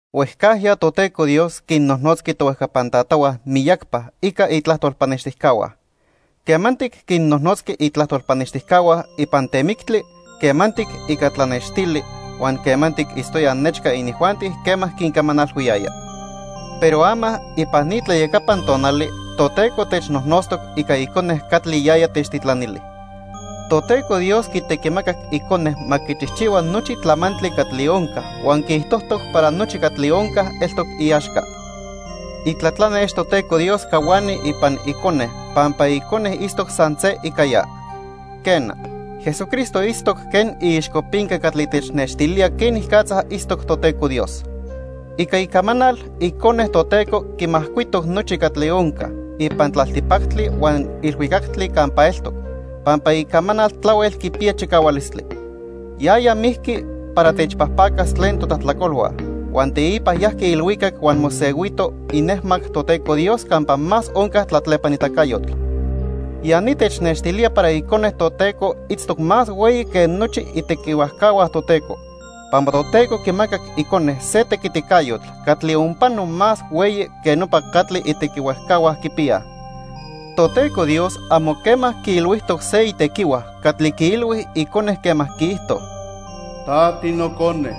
Huejcajya Toteco Dios quinnojnotzqui tohuejcapan tatahua miyacpa ica itlajtol pannextijcahua. Quemantic quinnojnotzqui itlajtol pannextijcahua ipan temictli, quemantic ica tlanextili huan quemantic itztoya nechca inijuanti quema quincamanalhuiyaya. Pero ama ipan ni tlayacapan tonali Toteco technojnotztoc ica Icone catli yaya techtitlanili. Toteco Dios quitequimacac Icone ma quichijchihua nochi tlamantli catli onca huan quiijtojtoc para nochi catli onca eltoc iaxca. Itlatlanex Toteco Dios cahuani ipan Icone pampa Icone itztoc san se ica ya. Quena, Jesucristo itztoc quen iixcopinca catli technextilía quenicatza itztoc Toteco Dios. Ica icamanal, Icone Toteco quimajcuitoc nochi catli onca ipan tlaltipactli huan ilhuicactli campa eltoc, pampa icamanal tlahuel quipiya chicahualistli. Yaya mijqui para techpajpacas tlen totlajtlacolhua huan teipa yajqui ilhuicac huan mosehuito inejmac Toteco Dios campa más onca tlatlepanitacayotl. Ya ni technextilía para Icone Toteco itztoc más hueyi que nochi itequihuajcahua Toteco, pampa Toteco quimacac Icone se tequiticayotl catli onpano más hueyi que nopa catli itequihuajcahua quipiyaj. Toteco Dios amo quema quiilhuijtoc se itequihua catli quiilhui Icone quema quiijto: "Ta tiNocone.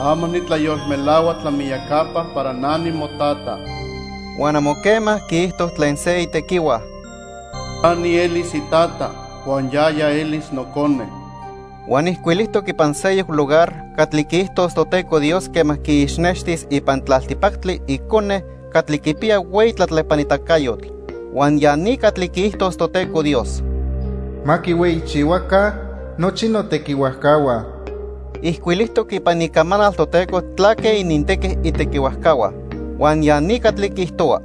Ama nitlayolmelahua tlamiyacapa para na nimoTata." Huan amo quema quiijto tlen se itequihua: "Na nielis iTata huan yaya elis Nocone." Huan ijcuilijtoc ipan seyoc lugar catli quiijtos Toteco Dios quema quiixnextis ipan tlaltipactli Icone catli quipiya hueyi tlatlepanitacayotl, huan ya ni catli quiijtos Toteco Dios: "Ma quihueyichihuaca nochi notequihuajcahua." Ijcuilijtoc ipan Icamanal Toteco tlaque inintequi itequihuajcahua, huan ya ni catli quiijtohua: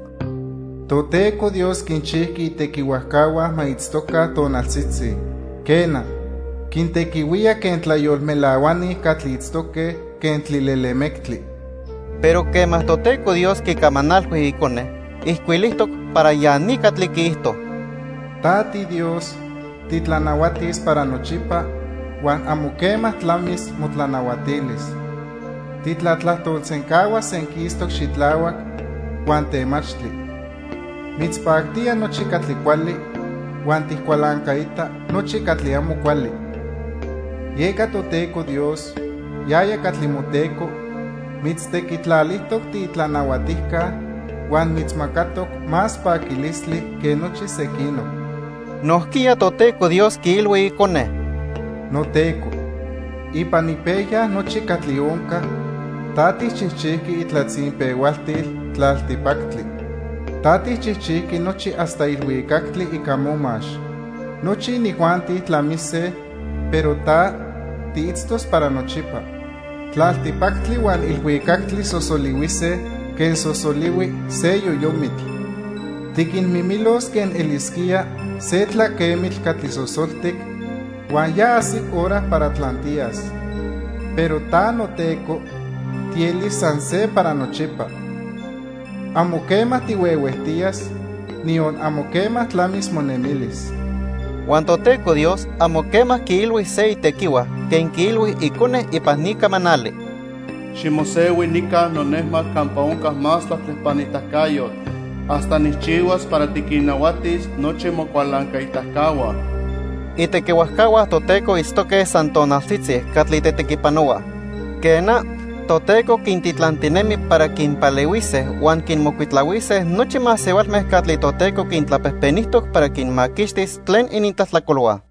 "Toteco Dios quinchijqui itequihuajcahua ma itztoca tonaltzitzi. Quena, quintequihuía quen tlayolmelahuani catli itztoque quen tlilelemectli." Pero quema Toteco Dios quicamanalhui Icone, ijcuilijtoc para ya ni catli quiijto: "Ta tiDios, titlanahuatis para nochipa huan amo quema tlamis motlanahuatilis. Titlatlajtolsencahuas senquistoc xitlahuac huan temachtli. Mitzpactía nochi catli cuali huan tijcualancaita nochi catli amo cuali. Yeca Toteco Dios, yaya catli moTeco, mitztequitlalijtoc tiitlanahuatijca huan mitzmacatoc más paquilistli que nochi sequinoc." Nojquiya Toteco Dios quiilhui Icone: "NoTeco, ipan ipejya nochi catli onca, ta tijchijchijqui itlatzinpehualtil tlaltipactli. Ta tijchijchijqui nochi hasta ilhuicactli ica momax. Nochi inijuanti tlamise, pero ta, tiitztos para nochipa. Tlaltipactli huan ilhuicactli sosolihuise quen sosolihui se yoyomitl. Tiquinmimilos quen elisquía se tlaquemitl catli sosoltic huan ya ajsic hora para tlantiyas. Pero ta, noTeco, tielis san se para nochipa. Amo quema tihuehuejtiyas, niyon amo quema tlamis monemilis." Huan Toteco Dios amo quema quiilhui se itequihua quen quiilhui Icone ipan ni camanali: "Ximosehui nica nonejmac campa onca más tlatlepanitacayotl, hasta nijchihuas para tiquinnahuatis nochi mocualancaitacahua." Itequihuajcahua Toteco itztoque san tonaltzitzi catli tetequipanohuaj. Quena, Toteco quintitlantinemi para quinpalehuise huan quinmocuitlahuise nochi masehualme catli Toteco quintlapejpenijtoc para quinmaquixtis tlen inintlajtlacolhua.